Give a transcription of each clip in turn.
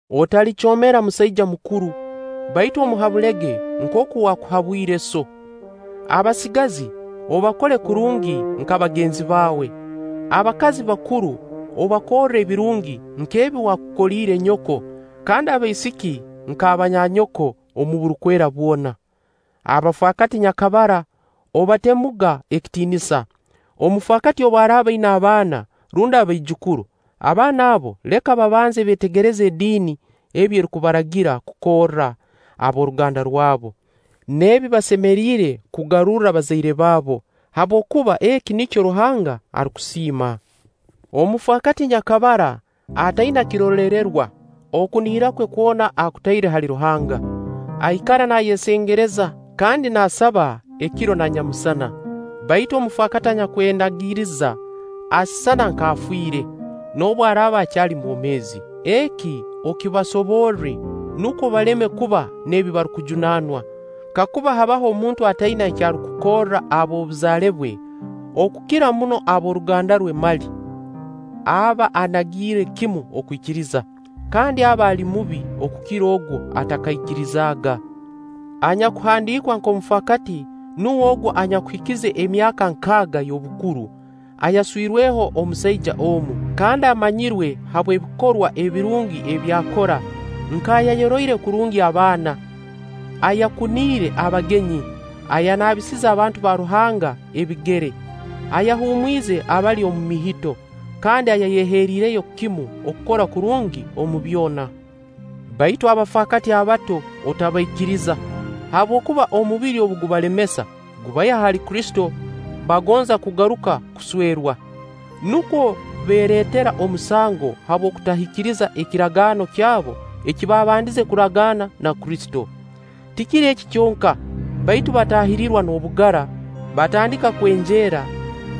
Otalicoomera musaija mukuru, baitu omuhabulege nkooku waakuhabwire sso. Abasigazi obakole kurungi nka bagenzi baawe, abakazi bakuru obakorre ebirungi nk'ebi wakukoliire nyoko, kandi abaisiki nka banyanyoko, omu burukwera bwona. Abafaakati nyakabara, obatemuga ekitiinisa. Omufaakati obu araaba aina abaana rundi abaijukuru, abaana abo leka babanze beetegereze ediini ebi erukubaragira kukorra ab'oruganda rwabo, n'ebi basemeriire kugarurra bazaire baabo; habwokuba eki nikyo Ruhanga arukusiima. Omufaakati nyakabara, ataina kiroleererwa, okunihira kwe kwona akutaire hali Ruhanga, aikara naayesengereza kandi naasaba ekiro na nyamusana. Baitu omufaakati anyakwenagiriza, asisana nk'afiire, noobu araaba akyali mwomeezi. Eki okibasoborre nukwo baleme kuba n'ebi barukujunaanwa. Kakuba habaho omuntu ataina eki arukukorra ab'obuzaale bwe, okukira muno ab'oruganda rwe mali, aba anagiire kimu okwikiriza, kandi aba ali mubi okukira ogu atakaikirizaaga. Anyakuhandiikwa nk'omufakaati nuwe ogu anyakuhikize emyaka nkaaga y'obukuru, ayaswirweho omusaija omu, kandi amanyirwe habw'ebikorwa ebirungi ebi akora, nk'ayayoroire kurungi abaana, ayakuniire abagenyi, ayanaabisize abantu ba Ruhanga ebigere, ayahumwize abali omu mihito, kandi ayayeheerireyo kimu okukora kurungi omu byona. Baitu abafaakati abato otabaikiriza; habwokuba omubiri obu gubalemesa, gubaiha hali Kristo, bagonza kugaruka kuswerwa. Nukwo beeretera omusango habw'okutahikiriza ekiragaano kyabo eki baabandiize kuragaana na Kristo. Tikiri eki kyonka, baitu bataahirirwa n'obugara, batandika kwenjeera,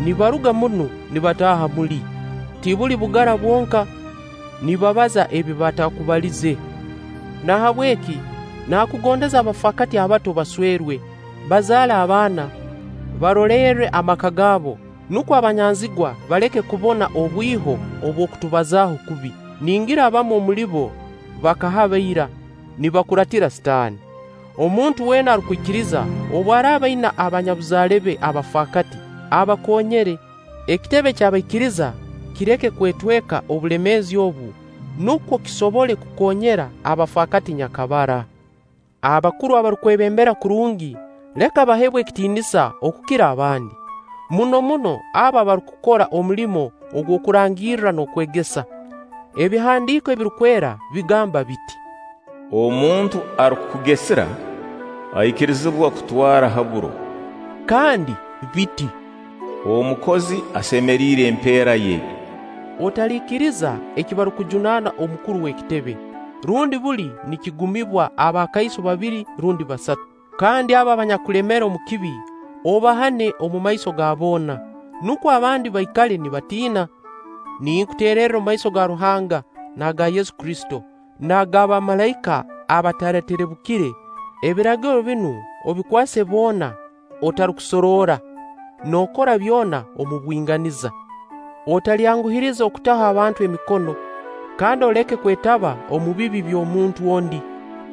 nibaruga munu nibataaha muli. Tibuli bugara bwonka, nibabaza ebi bataakubaliize. Nahabweki naakugondeze abafaakati abato baswerwe, bazaale abaana, barolerre amaka gaabo, nukwo abanyanzigwa baleke kubona obwiho obw'okutubazaaho kubi. Ningira abamu omuli bo bakahaba ira, nibakuraatira Sitaani. Omuntu weena arukwikiriza, obu araaba aina abanyabuzale be abafaakati, abakoonyere; ekitebe ky'abaikiriza kireke kwetweka obulemeezi obu, nukwo kisobole kukoonyera abafaakati nyakabara. Abakuru abarukwebembera kurungi, leka baheebwe ekitiinisa okukira abandi, muno muno abo abarukukora omulimo ogw'okurangirra n'okwegesa. Ebihandiiko Ebirukwera bigamba biti: “Omuntu arukukugesira, aikirizibwa kutwara ha buro.” kandi biti: “Omukozi asemeriire empeera ye.” Otaliikiriza eki barukujunaana omukuru w'ekitebe, rundi buli nikigumibwa abakaiso babiri rundi basatu. Kandi abo abanyakulemera omu kibi, obahane omumaiso ga boona, nukwo abandi baikale nibatiina. Ninkuteererra omumaiso ga Ruhanga, n'aga Yesu Kristo, n'aga bamalaika abataraterebukire, ebiragiro binu obikwase boona atarukusoroora, nookora byona omu bwinganiza. Otalyanguhiriza okutaho abantu emikono, kandi oleke kwetaba omu bibi by'omuntu ondi;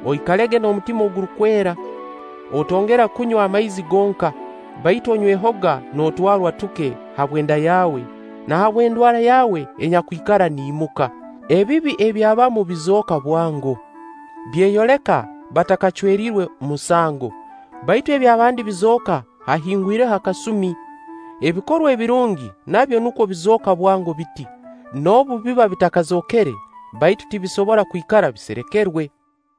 oikalege n'omutima ogurukwera. Otongera kunywa amaizi gonka, baitu onywehoga n'otwarwa tuke habw'enda yawe na habw'endwara yawe enyakwikara niimuka. Ebibi eby'abamu bizooka bwango, byeyoleka batakacweriiwe musango, baitu eby'abandi bizooka haahingwireho akasumi. Ebikorwa ebirungi nabyo nukwo bizooka bwango biti; noobu biba bitakazookere, baitu tibisobora kwikara biserekerwe.